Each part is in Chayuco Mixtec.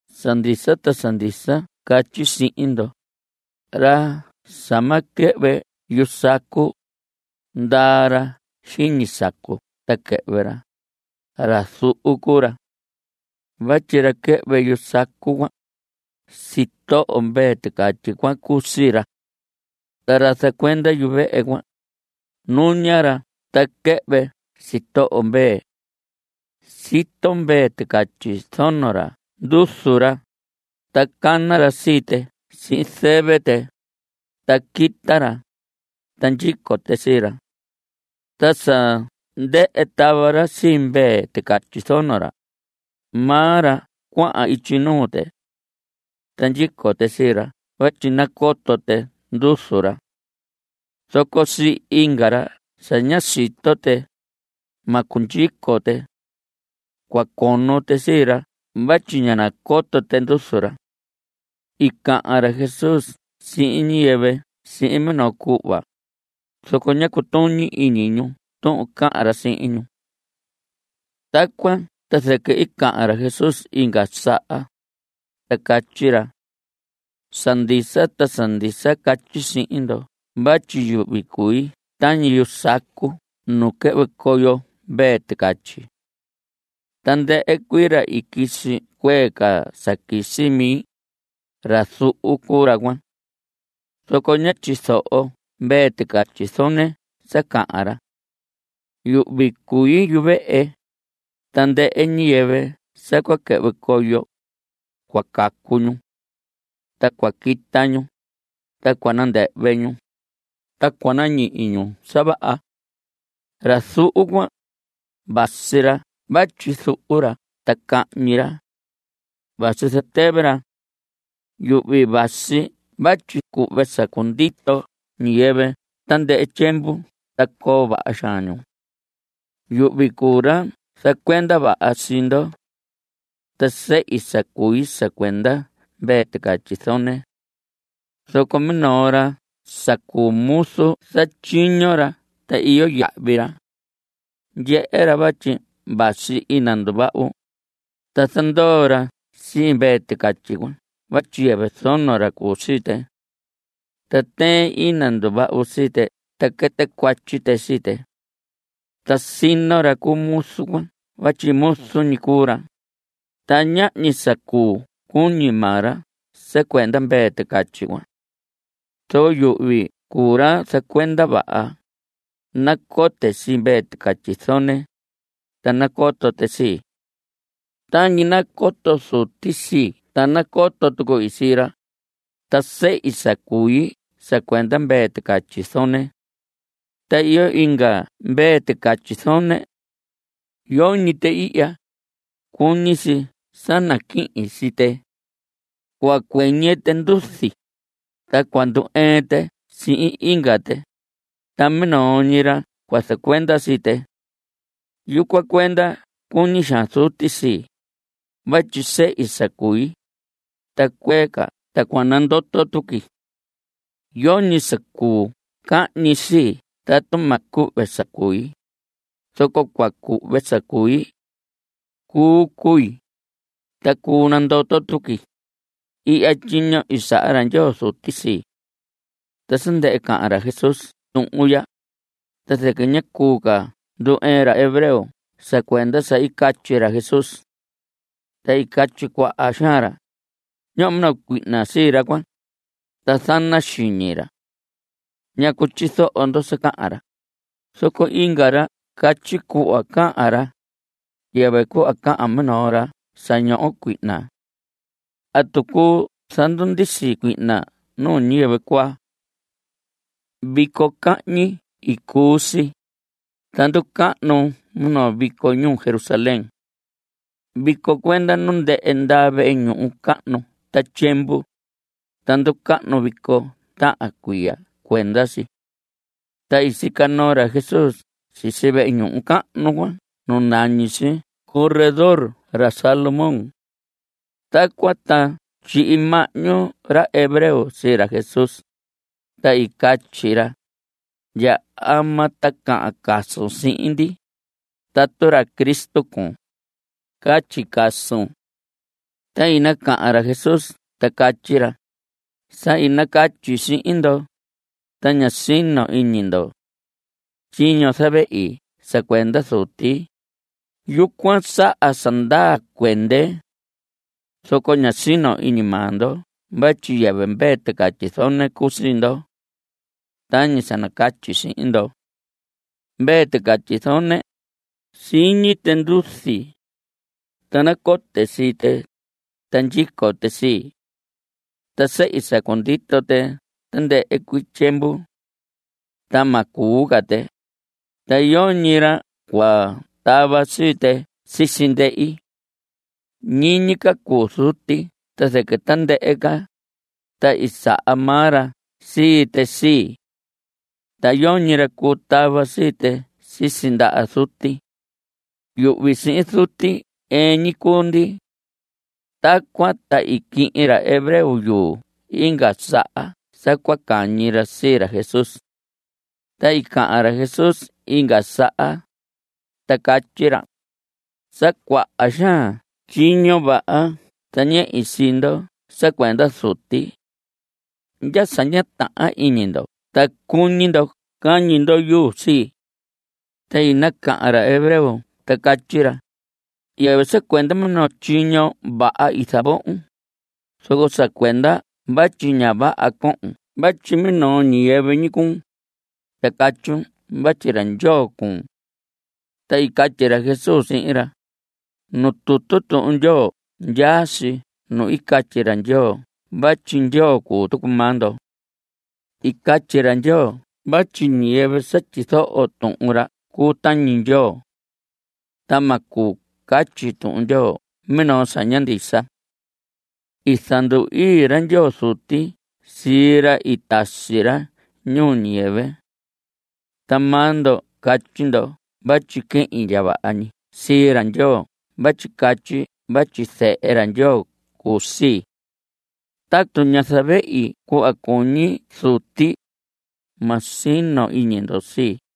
Sa ndisa ta sa ndisa catyi sihin ndo: Ra sa ma quɨhvɨ yu sacu, ndaa ra xiñi sacu ta quɨhvɨ ra; ra zuhu cuu ra. Vatyi ra quɨhvɨ yu sacu cuan, sitoho mvee ticatyi cuan cuu sii ra. Ta ra zacuenda yuvehe cuan, nuña ra ta quɨhvɨ sitoho mvee. Sito mvee ticatyi zono ra nduzu ra, ta cana ra sii tɨ sihin zɨvɨ tɨ, ta quita ra, ta ndyico tɨ sii ra. Ta sa ndɨhɨ tava ra sii mvee ticatyi zono ra, maa ra cuahan ityi nuu tɨ. Ta ndyico tɨ sii ra vatyi nacoto tɨ nduzu ra. Zoco sii inga ra sa ña sito tɨ, ma cundyico tɨ. Cua cono tɨ sii ra vatyi ña nacoto tɨ nduzu ra. I cahan ra Jesús sihin ñiyɨvɨ sihin minoo cuhva, zoco ñá cutuñi iñi ñu tuhun cahan ra sihin ñu. Tacuan ta zɨquɨ i cahan ra Jesús inga saha, ta catyi ra: Sa ndisa ta sa ndisa catyi sihin ndo vatyi yuhvi cui tañi yu sacu nu quɨhvɨ coyo mvee ticatyi. Tandɨhɨ cuii ra i quisi cuee ca sa quisi mi, ra zuhu cuu ra cuan. Zoco ña tyizoho mvee ticatyi zone sa cahan ra. Yuhvi cui yuvehe. Tandɨhɨ ñiyɨvɨ sa cua quɨhvɨ coyo, cua cacu ñu. Ta cua quita ñu, ta cua nandɨhvɨ ñu, ta cua nañihi ñu sa vaha. Ra zuhu cuan, vasi ra vatyi zuhu ra ta cahñi ra. Vasi zatɨvɨ ra. Yuhvi vasi vatyi cuhve sa cundito ñiyɨvɨ tandɨhɨ tyiemvu ta coo vaha xaan ñu. Yuhvi cuu ra zacuenda vaha sii ndo. Ta sehi sa cui sa cuenda mvee ticatyi zone. Zoco minoo ra sa cuu muzu, zatyiño ra ta iyo yahvi ra. Ndyehe ra vatyi vasi ina nduvahu, ta zandoo ra sii mvee ticatyi cuan vatyi yɨvɨ zono ra cuu sii tɨ. Ta tɨɨn ina nduvahu sii tɨ ta quɨtɨ cuatyi tɨ sii tɨ. Ta sino ra cu muzu cuan vatyi muzu ñi cuu ra, ta ñahñi sa cuu cuñi maa ra sa cuenda mvee ticatyi cuan. Zoco yuhvi cuu ra zacuenda vaha. Nacote sii mvee ticatyi zone, ta nacoto tɨ sii. Tañi nacoto Zuti sii ta nacoto tuqui sii ra. Ta sehi sa cui sa cuenda mvee ticatyi zone. Ta iyo inga mvee ticatyi zone. Yoñi tɨ ihya. Cuñi si sa naquihin sii tɨ. Cua cuɨñɨ tɨ nduzi, ta cua ndu‑ɨɨn tɨ sihin inga tɨ, ta minoo ñi ra cua zacuenda sii tɨ. Yucuan cuenda cuñi xaan Zuti sii, vatyi sehi sa cui, ta cuee ca ta cua nandoto tuqui. Yoñi sa cuu cahñi sii tatu ma cuhve sa cui, zoco cua cuhve sa cui. Cuu cui, ta cuu nandoto tuqui. Ihya tyiño i saha ra Ndyoo Zuti sii. Ta sa ndɨhɨ cahan ra Jesús tuhun ya, ta zɨquɨ ña cuu ca ndu‑ɨɨn ra hebreo sa cuenda sa i catyi ra Jesús. Ta i catyi cuaha xaan ra: Ñoho minoo cuihna sii ra cuan, ta zana xiñi ra. ¿Ñacu tyizoho ndo sa cahan ra? Zoco inga ra catyi: Cuhva cahan ra, yɨvɨ cuhva cahan minoo ra sa ñoho cuihna. ¿Atu cuu zandundisi cuihna nuu ñiyɨvɨ cuaa? Vico cahñi i cuu si, ta nducahnu minoo vico ñuu Jerusalén. Vico cuenda nu ndɨhɨ ndaa vehe ñuhu cahnu ta tyiemvu, ta nducahnu vico tahan cuiya cuenda si. Ta i sica noo ra Jesús sisi vehe ñuhu cahnu cuan nu nañi si corredor ra Salomón. Tacuan ta tyihi mahñu ra hebreo sii ra Jesús, ta i catyi ra: ¿Ndya ama ta cahan casun sihin ndi? Tatu ra Cristo cuun, catyi casun. Ta i nacahan ra Jesús ta catyi ra: Sa i nacatyi sihin ndo, ta ña sino iñi ndo. Tyiño zavehi sa cuenda Zuti, yucuan saha sa ndaa cuende. Zoco ña sino iñi maa ndo vatyi yɨvɨ mvee ticatyi zone cuu sii ndo. Tañi sa nacatyi sihin ndo. Mvee ticatyi zone, siñi tɨ nduzi. Ta nacote sii tɨ, ta ndyico tɨ sii. Ta sehi sa cundito tɨ tandɨhɨ cuii tyiemvu. Ta ma cuu ca tɨ. Ta yoñi ra cua tava sii tɨ sisi ndehi. Ñiñi ca cuu Zuti ta zɨquɨ tandɨhɨ ca, ta i saha maa ra sii tɨ sii. Ta yoñi ra cuu tava sii tɨ sisi ndaha Zuti. Yuhvi sihin Zuti ɨɨn ñi cuu ndi. Tacuan ta i quihin ra hebreo yuu inga saha sa cua cañi ra sii ra Jesús. Ta i cahan ra Jesús inga saha, ta catyi ra: Sa cuaha xaan tyiño vaha zañehi sii ndo sa cuenda Zuti. ¿Ndya sa ña tahan iñi ndo ta cuñi ndo cañi ndo yuu sii? Ta i nacahan ra hebreo ta catyi ra: Yɨvɨ sa cuenda minoo tyiño vaha i zavohon, zoco sa cuenda vatyi ña vaha cohon vatyi minoo ñiyɨvɨ ñi cuun, ta catyun vatyi ra Ndyoo cuun. Ta i catyi ra Jesús sihin ra: Nuu tutu Tuhun Ndyoo ndyaa si nu i catyi ra Ndyoo vatyi ndyoo cuu tucu maa ndo. I catyi ra Ndyoo vatyi ñiyɨvɨ sa tyizoho Tuhun ra cuu tañi Ndyoo. Ta ma cuu catyi Tuhun Ndyoo minoo sa ña ndisa. I zandu‑ii ra Ndyoo Zuti sii ra i tasi ra ñuu ñiyɨvɨ. Ta maa ndo catyi ndo vatyi quehin ndya vaha ñi sii ra Ndyoo vatyi catyi vatyi Zehe ra Ndyoo cuu sii. Tatu ña zavehi cuhva cuñi Zuti, ma sino iñi ndo sii.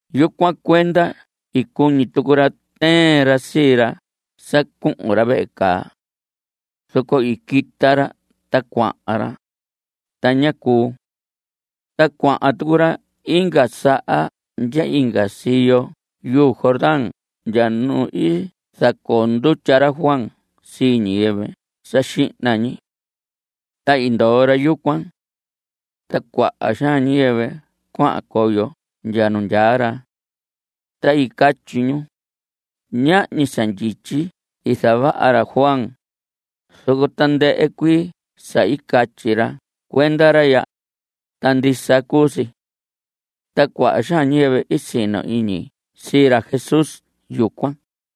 Yucuan cuenda i cuñi tucu ra tɨɨn ra sii ra sa cuhun ra vehe caa. Zoco i quita ra ta cuahan ra, ta ñá cuu. Ta cuahan tucu ra inga saha ndya inga siyo yuu Jordán ndya nu i zacoo ndutya ra Juan sii ñiyɨvɨ sa xihna ñi. Ta i ndoo ra yucuan. Ta cuaha xaan ñiyɨvɨ cuahan coyo ndya nu ndyaa ra. Ta i catyi ñu: Ñahñi sa ndyityi i zavaha ra Juan, zoco tandɨhɨ cuii sa catyi ra cuenda ra ya, ta ndisa cuu si. Ta cuaha xaan ñiyɨvɨ i sino iñi sii ra Jesús yucuan.